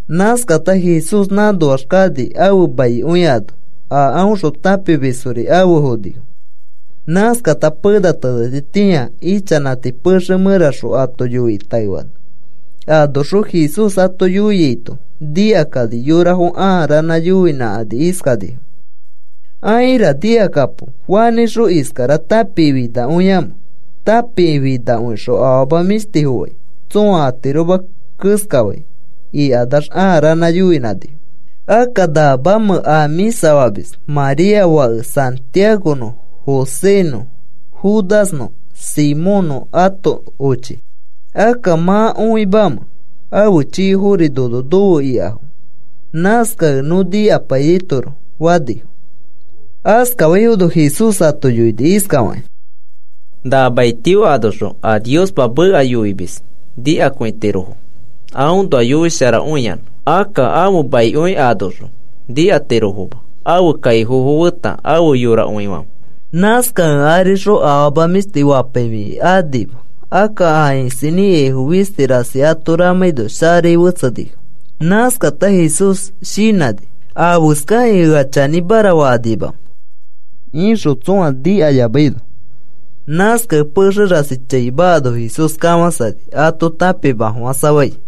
Nãskata Jesús nãnoax kani ãfe maikõi ano. A aõxõ tãpimisfori afe fonifo. Nãskata pena tenetitĩa ichanãti pexe mẽraxõ ato yoikĩ taefani. Anoxõ Jesús ato yoiaito nikakani yorafo ãa ranã yoinãkani iskanifo: “Aira nikakapo, ¿Fanĩxõ iskara tãpikĩ finakõiamẽ? Tãpikĩ finakõixõ afama mĩshtifo fai tsõa atiroma keskafai,” ikanax ãa ranã yoinãnifo. “¿Akka namamẽ a mĩsa famis? María fake Santiagonõ Josénõ Judasnõ Simónnõ ãto ochi. ¿Akka mã õimamẽ afe chikofori nono nofe ikafo? Nãskakẽ nõ nikapaiyaitoroko,” fanifo. Askafaifono Jesús ato yoini iskafakĩ: “Na mai tio anoxõ a Niospa meka yoimis nikakõitirofo aõnoa yoisharakõiyanã. Akka ãfe maikõi anoxõ nikatirofoma, ãfe kaifofo feta afe yorakõifãfe.” Nãskakẽ arixõ afama mĩshti fapaifikĩ anima. Akka a isinĩ ikaifo fisti rasi ato ramãino sharai fetsenifo. Nãskata Jesús shinãni: “¿Afeskakĩ ea chanĩmara fakanimamẽ?” ixõ tsõa nikayamaino. Nãskakẽ pexe rasi chaima ano Jesús kafãsani ato tãpimafofãsafai.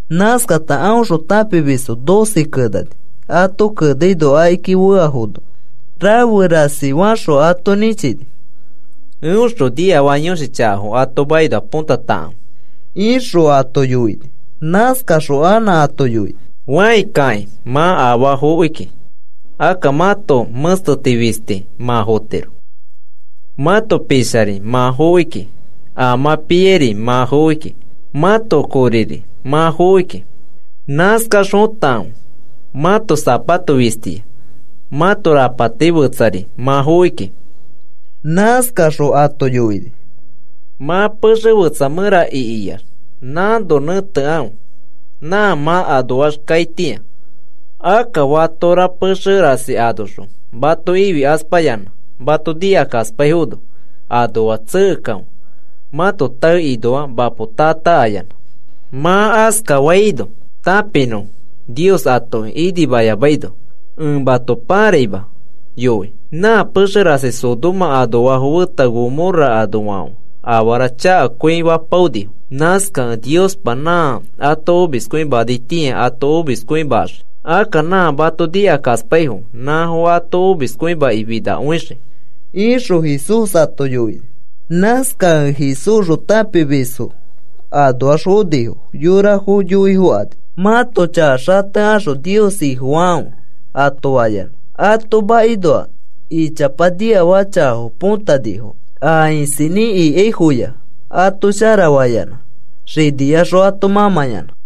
Nãskata aõxõ tãpimisfo doce kenani. Ato kenaino akiki feafono rafe rasi faxõ ato nĩchini: “Eõxõ niafaka yõshi chakafo ato makinoa põtatakãfe,” ixõ ato yoini. Nãskaxõ anã ato yoini: “Fãi kakĩ, mã afaa fokiki, akka mãto mẽsteti fisti mã fotiro. Mãto pishari mã fokiki a mã piairi mã fokiki mãto koriri mã fokiki. Nãskax fotakãfe mãto sapato fistiya, mãto rapati fetsari mã fokiki.” Nãskaxõ ato yoini: “Mã pexe fetsa mẽra ikiax nãno nẽtekãfe, nã mã anoax kaitĩa. Akka fatora pexe rasi anoxõ mato ifikaspayanã mato nikakaspaifono anoax tsekekãfe mãto taekinoa mapo taa taa ayanã. Mã askafaino tãpinõfo Nios atoki inimayamaino. Ẽ mato parakima yoi. Nã pexe rasi Sodoma anoafo feta Gomorra anoafãfe afara chakakõi fapaonifo. Nãskakẽ Niospa nã ato omiskõimanaitĩa ato omiskõimaxii. Akka nã mato nikakaspaifo nãfo ato omiskõimaki finakõixii,” ixõ Jesús ato yoini. Nãskakẽ Jesúsxõ tãpimisfo anoax fonifo yorafo yoifokani. “Mãto chaka xatekaxõ Nios Ifofakãfe,” ato fayanã. Ato makinoa ichapa niafaka chakafo potanifo. A isinĩ ikaifoya ato sharafayanã xiniyaxõ ato mãmãyanã.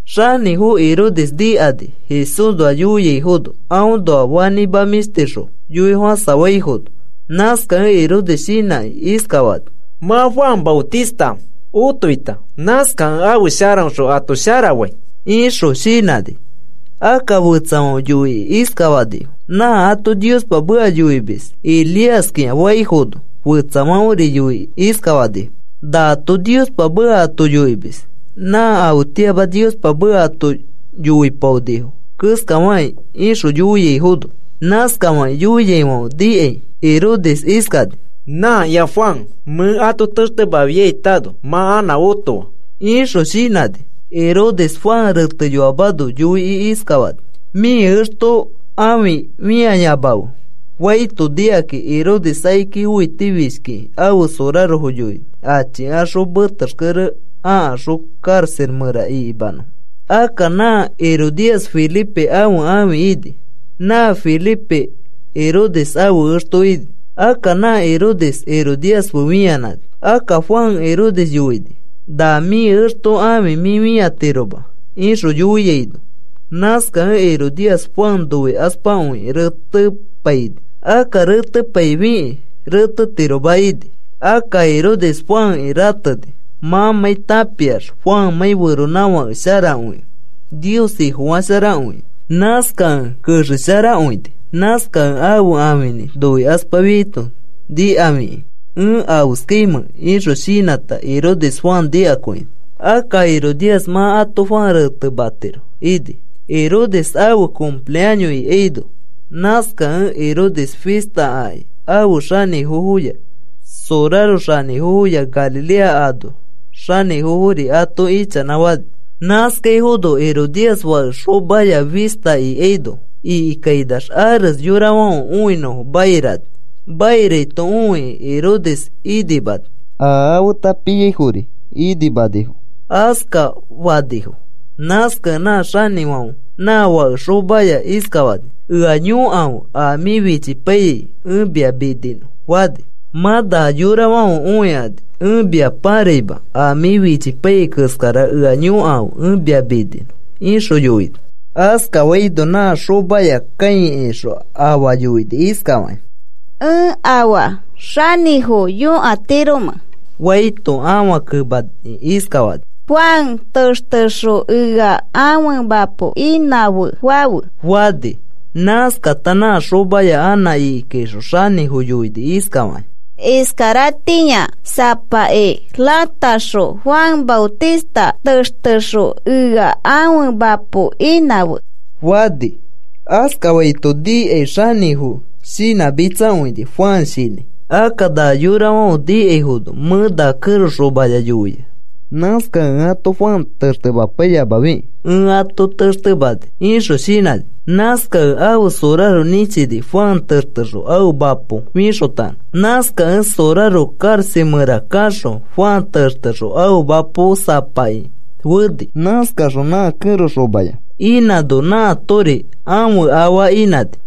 Xanĩfo Herodes nikani Jesúsnoa yoiaifono aõnoa fanĩma mĩshtixõ yoifofãsafaifono. Nãskakẽ Herodes shinãkĩ iskafani: “Mã Juan Maotista otoita, nãskakẽ ãfe sharaõxõ ato sharafai,” ixõ shinãni. Akka fetsafãfe yoikĩ iskafanifo: “Nã ato Niospa meka yoimis Elíaskĩa,” faifono, fetsafãferi yoikĩ iskafanifo: “Nato Niospa meka ato yoimis, nã afetĩama Niospa meka ato yoipaonifo keskafakĩ,” ixõ yoiaifono. Nãskafakĩ yoiaifãfe nikai Herodes iskani: “Nãkĩa Juan, mẽ ato textemafiaitano mã anã otoa,” ixõ shinãni. Herodes Juan reteyoamano yoikĩ iskafani: “Mĩ exto ãfi fĩayamafe,” faito nikakĩ, Herodes akiki õitifishkiki ãfe sorarofo yoini achikaxõ metexkere akaxõ karaxa mẽra ikimanõfo. Akka nã Herodías Felipe ãfe ãfi ini, nã Felipe Herodes ãfe exto ini. Akka nã Herodes Herodías fe fĩanãni. Akka Juan Herodes yoini: “Na mĩ exto ãfi mĩ fĩatiroma,” ixõ yoiaino, nãskakẽ Herodías Juan noikaspakõikĩ retepaini. Akka retepaifikĩ retetiroma ini. Akka Herodes Juanki rateni mãmãi tãpiax Juanmãi feronãfake sharakõikẽ Nios Ifofasharakõia. Nãskakẽ kexesharakõini. Nãskakẽ ãfe ãfinĩ noikaspafiaito nikafikĩ, “¿Ẽ afeskaimẽ?” ixõ shinãta, Herodes Juan nikakõini. Akka Herodías mã ato Juan retematiro ini, Herodes ãfe cumpleaños ikaino. Nãskakẽ Herodes fista akĩ afe xanĩfofoya soraro xanĩfofoya Galilea anoa xanĩfofori ato ichanãfani. Nãskaifono Herodías fake xomaya fista ikaino ikikainax ares yorafãfe õinõfo mairani. Mairaito õikĩ Herodes inimani, a afeta piaifori inimanifo askafanifo. Nãskakẽ nã xanĩfãfe nã fake xomaya iskafani: “Ea yõkafe a mĩ fichipaiyai, ẽ mia mininõ,” fani. “Mã na yorafãfe õikani ẽ mia pãraima a mĩ fichipaiyai keskara ea yõkafe ẽ mia mininõ,” ixõ yoini. Askafaino nã xomaya kãikaixõ afa yoini iskafakĩ: “¿Ẽ afaa xanĩfo yõkatiromẽ?” faito ãfa kemakĩ iskafani: “Juan textexõ ea ãfe mapo inãfe fafe,” fani. Nãskata nã xomaya anã ikikaixõ xanĩfo yoini iskafakĩ: “Iskaratĩa sapaki rãtaxõ Juan Maotista textexõ ea ãfe mapo inãfe,” fani. Askafaito nikai xanĩfo shinãmitsakõini, Juan shinãi. “Akka na yorafãfe nikaifono mẽ na kẽro xomaya yoia. Nãskakẽ ẽ ato Juan textemapaiyamafikĩ ẽ ato textemani,” ixõ shinãni. Nãskakẽ ãfe soraro nĩchini, Juan textexõ ãfe mapo fixotanõ. Nãskakẽ soraro karaxa mẽra kaxõ, Juan textexõ ãfe mapo sapaki feni. Nãskaxõ nã kẽro xomaya inãno, nãatori ãfe afa inãni.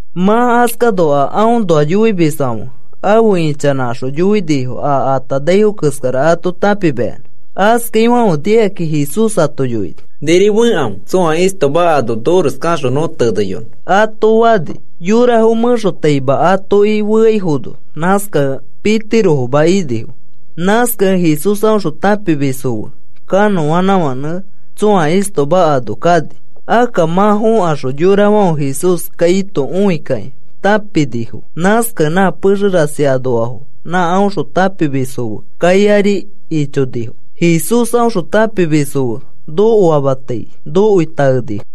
Mã askano a aõnoa yoimisfãfe afe ichanãkaxõ yoinifo a atanaifo keskara ato tãpimayanã. Askafaifãfe nikakĩ Jesús ato yoini: “Niri fekãfe tsõa istoma ano nores kaxõ nõ teneyonõ,” ato fani. Yorafo mẽxotaima atoki feaifono, nãskakẽ pitirofoma inifo. Nãskakẽ Jesús aõxõ tãpimisfo fe kanõanãfãnẽ tsõa istoma ano kani. Akka mã fõkaxõ yorafãfe Jesús kaito õikakĩ tãpinifo. Nãskakẽ nã pexe rasi anoafo nã aõxõ tãpimisfo fe kai ari ichonifo. Jesús aõxõ tãpimisfo fe nokoamatai nokoi taenifo.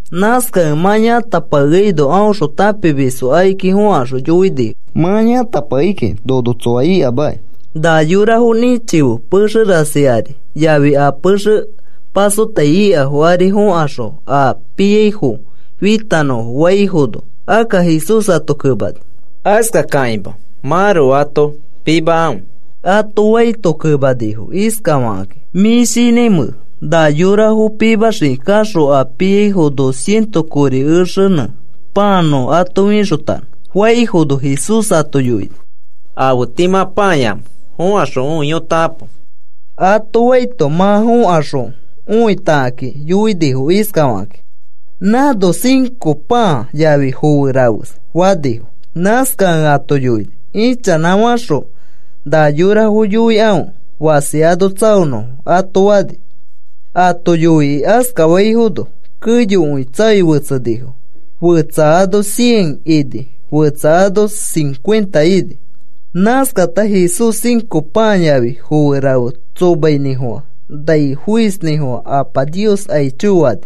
Nãskakẽ mã yãtapakeaino aõxõ tãpimisfo akiki fõkaxõ yoinifo: “Mã yãtapakei kiki nono tsoa ikamakĩ. Na yorafo nĩchife pexe rasi ari yafi a pexe pasotai ikafo ari fokaxõ a piaifo fitanõfo,” faifono, akka Jesús ato kemani: “Askakakĩma mãroko ato pimakãfe,” ato faito, kemanifo iskafakakĩ: “¿Mĩ shinãimẽ na yorafo pimaxiki kaxõ a piaifo dos cientos kori exenẽ pãa nõ ato fixotanõ?” faifono, Jesús ato yoini: “¿Afe tii mã pãayamẽ? Fokaxõ õiyotakãpo,” ato faito, mã fokaxõ õitakakĩ yoinifo iskafakakĩ: “Nãno cinco pãa yafi foe rafes,” fanifo. Nãskakẽ ato yoini: “Ichanãfaxõ na yorafo yoikãfe fasi ano tsaonõfo,” ato fani. Ato yoikĩ askafaifono keyokõi tsaoi fetsenifo, fetsa ano cien ini, fetsa ano cincuenta ini. Nãskata Jesús cinco pãa yafi foe rafe tsomainĩfofã, nai foisnĩfofã Apa Nios aicho fani.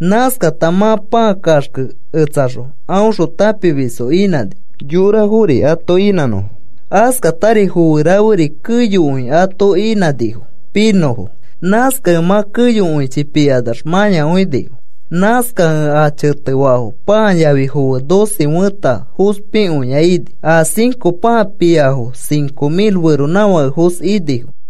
Nãskata mã pãa kaxkeketsaxõ aõxõ tãpimisfo inãni, yorafori ato inãnõfo. Askatari foe raferi keyokõi ato inãnifo pinõfo. Nãskakẽ mã keyokõichi pikanax mãyakõinifo. Nãskakẽ a chetefaafo pãa yafi foe doce fẽta fospikõiya ini. A cinco pãa piaifo cinco mil feronãfakefos inifo.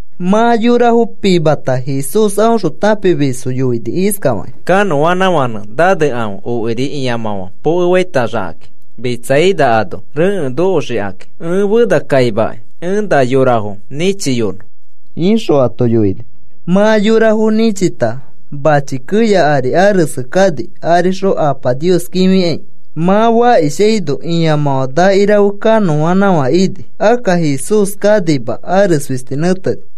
Mã yorafo pimata Jesús aõxõ tãpimisfo yoini iskafakĩ: “Kanõanãfãnẽ nanekãfe okiri ĩamãfã pokefaitaxikãki Betsaida ano rekẽ nokotaxikakĩ. Ẽ fenakaimakai, ẽ na yorafo nĩchiyonõ,” ixõ ato yoini. Mã yorafo nĩchita mãchi keya ari arese kani arixõ Apa Nios kĩfikai. Mã fakishaino ĩamãfã nakirafe kanõanãfã ini. Akka Jesús kanima, ares fisti nẽteni.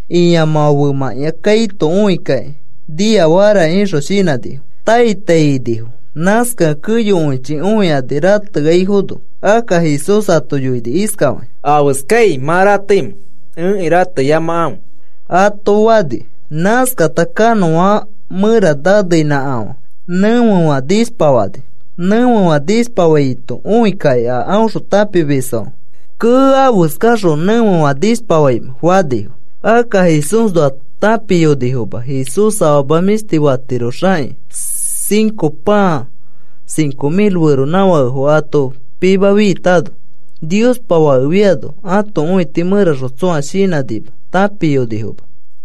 Ĩamãfã femãkĩa kaito õikakĩ niafakara ixõ shinãkani. Tai tai inifo. Nãskakẽ keyokõichi õikani rateaifono. Akka Jesús ato yoini iskafakĩ: “¿Afeskai mã rateimẽ? Ẽki rateyamakãfe,” ato fani. Nãskata kanõanãfã mẽra naneinãkafã, nẽfefã nishpafani. Nẽfefã nishpafaito õikakĩ a aõxõ tãpimisfãfe, “¡Kee! ¿Afeskaxõ nẽfefã nishpafaimẽ?” fanifo. Akka Jesúsnoa tãpiyonifoma, Jesús afama mĩshti fatiroxakĩ cinco pãa cinco mil feronãfakefo ato pimafiitano. Niospa Fake fiano ãto õiti mẽraxõ tsõa shinãnima, tãpiyonifoma.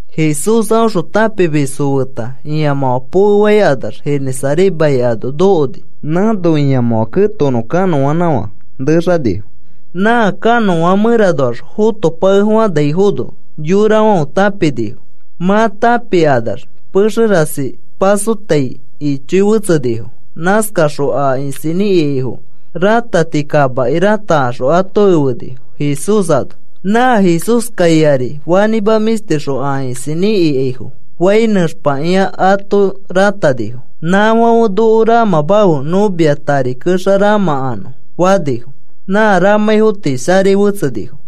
Jesús aõxõ tãpimisfo feta ĩamãfã pokefainax Genesaret mai ano nokoni. Nãno ĩamãfã ketokonõ kanõanãfã nexanifo. Nã kanõanãfã mẽranoax fotopakefofãnaifono, yorafãfe tãpinifo. Mã tãpikanax pexe rasi pasotai ichoi fetsenifo. Nãskakaxõ a isinĩ ikaifo, rãtati kamaki rãtakaxõ ato efenifo Jesús ano. Nã Jesús kai ari fanĩma mĩshtixõ, a isinĩ ikaifo fai nẽxpakĩa ato rãtanifo. Nãfãfe, “Noko ramãmafe nõ mia tari kexa ramãkanõ,” fanifo. Nã ramãifo tii sharai fetsenifo.